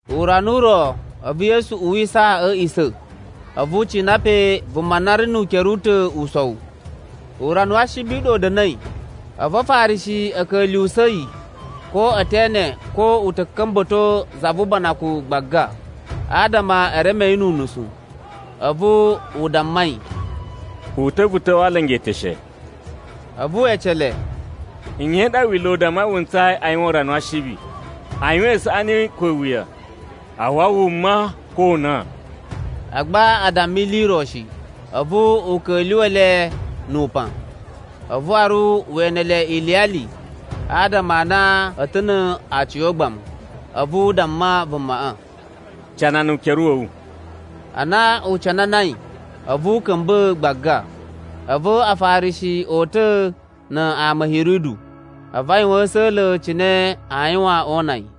Urana u ro a̱vu Yesu uwisa a̱ a̱a̱ꞌisa̱, a̱vu u cina pe vuma na ri nu ukere u ta̱ usowu. Urana wa Ashibi u ɗa u da̱na̱i, a̱vu Afarishi a̱ ka̱lyuwusa̱ yi ko e te ene ko u ta̱ ka̱mba̱to za vu ubanakun gbaga, adama e reme yi nu unusu. A̱vu u damma yi, “Uta̱ vu ta̱wa̱ a alanga eteshe.” A̱vu we ece le, “Nye i ɗa Wila̱ u dammai wu ntsayi a yuwan urana wa Ashibi, a yuwan isaꞌani ko iwuya, a wawa wuma ko o una?” Agba a damma ili i ro shi. A̱vu u ka̱lyuwa̱ le nu upan, a̱vu waru we ene le iliyali adama a na a̱ ta̱ na aciyogbamu. A̱vu u damma vumaꞌa, “Canana ukere wa̱ wu.” Ana u cananai, a̱vu u ka̱mba̱ gbaga. A̱vu Afarishi o uta̱ na ama a̱ Hiridu, a̱vu a yuwan a̱sa̱la̱ cine aa yuwan oo una yi.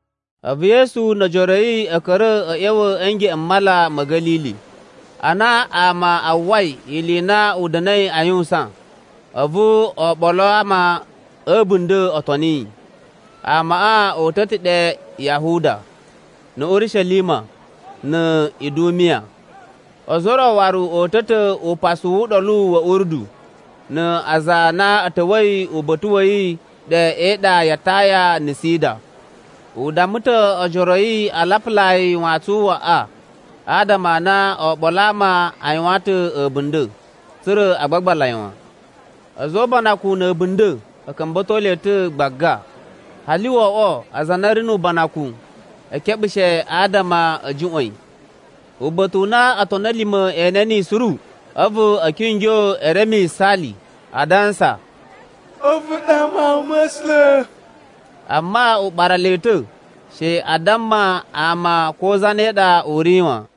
A̱vu Yesu no ojoro a̱ yi a̱ ka̱ra̱ a̱ ꞌya̱wa̱ a̱ ngeꞌen m Mala ma̱ Ga̱lili. Ana ama a uwwai ili i na u da̱na̱i a yuwusan, a̱vu oɓolo a ama a̱ a̱bunda̱ o toni yi. Amaꞌa o uta̱ ta̱ ɗe Yahuda, na̱ Urishelima, na̱ Idumiya. Ozo o ro waru o uta̱ ta̱ upasalai wu Uɗolu wa̱ Urdu, na aza a na a̱ ta̱wa̱i uba̱ta̱ wa̱ yi ɗe e iɗa ya Taya na̱ Sida. U damma ta̱ ojoro a̱ yi a lapulaa yi wantsun u waꞌa, adama a na oɓolo a ama a yuwan ta̱ a̱bunda̱, tsa̱ra̱ a gbagbala yi wan. A̱za̱ o ubanakun na̱ a̱bunda̱, a̱ ka̱mba̱to le ta̱ gbaga, hali wo oꞌwo aza a na a̱ ri nu ubanakun e keɓushe adama a̱ juꞌwa̱n yi. Uba̱ta̱ u na otoni a̱ lima̱ e ene niyi suru, a̱vu a̱ kingyo e reme yisaali, adansa, “A̱vu ɗa Mawun ma̱ A̱sula̱.” Amma u ɓara le ta̱ she a damma ama ko zane ɗa u ri wan.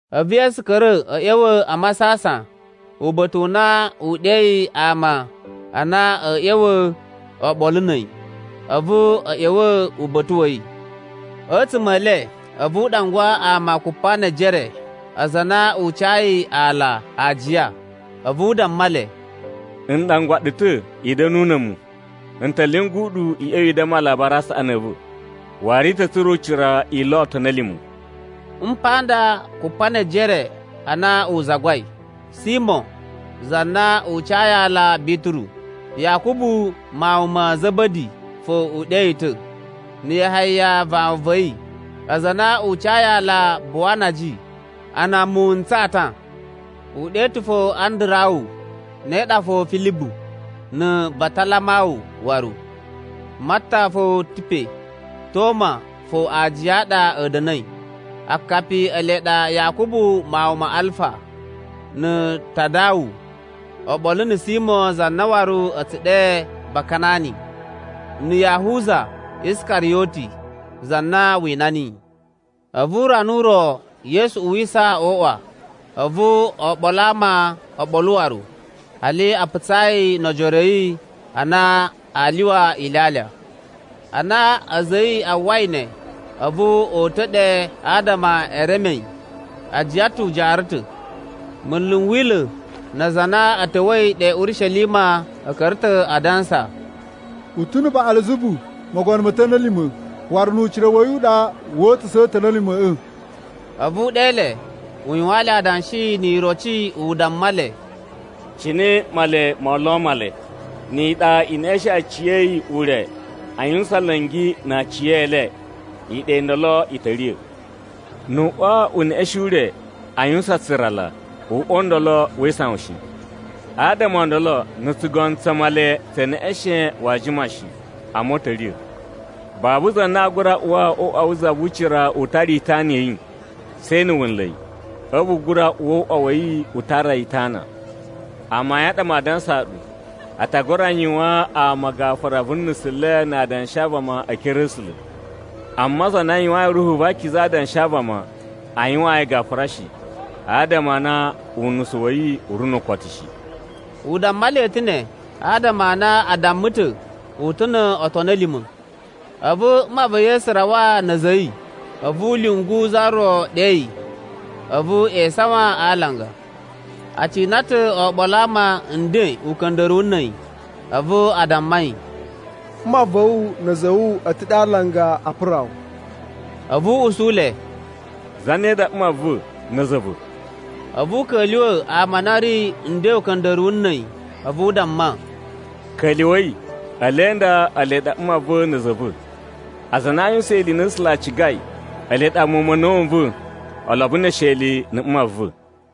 A̱vu Yesu ka̱ra̱ a̱ ꞌya̱wa̱ a masasan uba̱ta̱ u na u ɗeyi ama a na a̱ ꞌya̱wa̱ oɓolo na̱ a̱yi, a̱vu a̱ ꞌya̱wa̱ uba̱ta̱ wa̱ yi. A̱tsuma̱ e le a̱vu u ɗangwa ama kupa ne ejere aza a na u cayi ala ajiya. A̱vu u damma le, “N ɗangwa ɗu ta̱ i da̱nu na̱ a̱mu. N ta̱ lyungu ɗu i ꞌya̱wa̱ i damma Alabari a Saꞌani a̱ va̱. Waru i ta̱ tsura̱ ucira i lo otoni a̱ lima̱.” Mpa nda Kupanejere a na u zagwai: Simo za na u cayi aala Bituru, Yakubu mawun ma̱ Za̱ba̱di fo u ɗe yi ta̱, na̱ Yahaya vawun va̱ yi, aza a na u cayi ala Buwanaji, ana muwun n tsata; u ɗe ta̱ fo Andarawu, ne ɗa fo Filibu, na̱ Batalamawu waru, Matta fo ta̱ pe, Toma fo aajiya a ɗa a̱ da̱na̱i. Akapi e le ele ɗa Yakubu mawun ma Alfa, na̱ Tadawu, oɓolo na̱ Simo za na waru a̱ tsu ɗe Bakanani, na̱ Yahuza Iskariyoti, za na wina niyi. A̱vu urana u ro Yesu uwisa o uꞌwa, a̱vu oɓolo a ama o ɓolo waru, hali a putsa yi no ojoro a̱ yi na aa lyuwa ilyalya. Ana a̱za̱ a̱ yi a uwwai ne, a̱vu o uta̱ ɗe adama e reme yi, a jiyan ta̱ u jaara ta̱. Munlu n Wila̱ na aza a na a̱ ta̱wa̱i ɗe Urishelima a̱ ka̱ra̱ ta̱ a dansa, “U ta̱ na̱ Baꞌalzabu mogono mo otoni a̱ lima̱, waru nu ucira wa̱ yi u ɗa woo uta̱sa̱a̱ otoni a̱ lima̱ꞌa̱.” A̱vu u ɗe le, u yuwaan le adanshi ni iroci u damma le, “Cine Male moo lo Male? Ni iɗa i neꞌeshen aciya̱yi ure a yuwusan nla̱ngi na aciyele, iɗa i ndolo i ta̱ riya̱. Nu u uꞌwa u neꞌeshen ure, a yuwusan tsurala, uꞌwa u ndolo wee isawan shi. Adama o ndolo na̱ tsugono tsa Male tse neꞌeshen waa jima shi, amma u ta̱ riya̱. “Babu za na aa gura uwa o uꞌwa wu za vu ucira u tara itana ya̱ yi, she na̱ wu nla̱ yi. A̱vu u gura uwa o uꞌwa wa̱ yi u tara yi itana. Amayun a ɗa maa dansaa ɗu, a ta gura yuwaan ama gafura vu nusu le na adanshi a vama e ekere a̱ A̱sula̱. Amma za na yuwayin Ruhu va Akiza adanshi a vama, aa yuwaan yi gafura shi, adama a na unusu wa̱ yi u ri nu ukotu shi.” U damma le ta̱ ne, adama a na a damma ta̱, “U ta̱ no otoni a̱ lima̱.” A̱vu mma va̱ Yesu rawa na̱ a̱za̱ a̱ yi. A̱vu a̱ lyungu za ro ɗe yi. A̱vu e isawan a alanga. A cina ta̱ oɓolo a ama nden uka̱nda̱ruwu na̱ a̱yi, a̱vu a damma yi, “Mma va̱ wu, na̱ a̱za̱ a̱ wu, a̱ ta̱ ɗe a alanga a pura wu.” A̱vu u usu le, “Zane ɗa mma va̱ na̱ a̱za̱ a̱ va̱?” A̱vu u ka̱lyuwa̱ ama a na a̱ ri nden uka̱nda̱ruwu na̱ a̱yi, a̱vu u damma, “Ka̱lyuwa̱i, ele nda ele ɗa mma va̱ na̱ a̱za̱ a̱ va̱. Aza a na a yuwusan ili i na A̱sula̱ a cigai, ele ɗa muwun ma̱ a̱na̱wu n va̱ olobo ne esheli na̱ mma va̱.”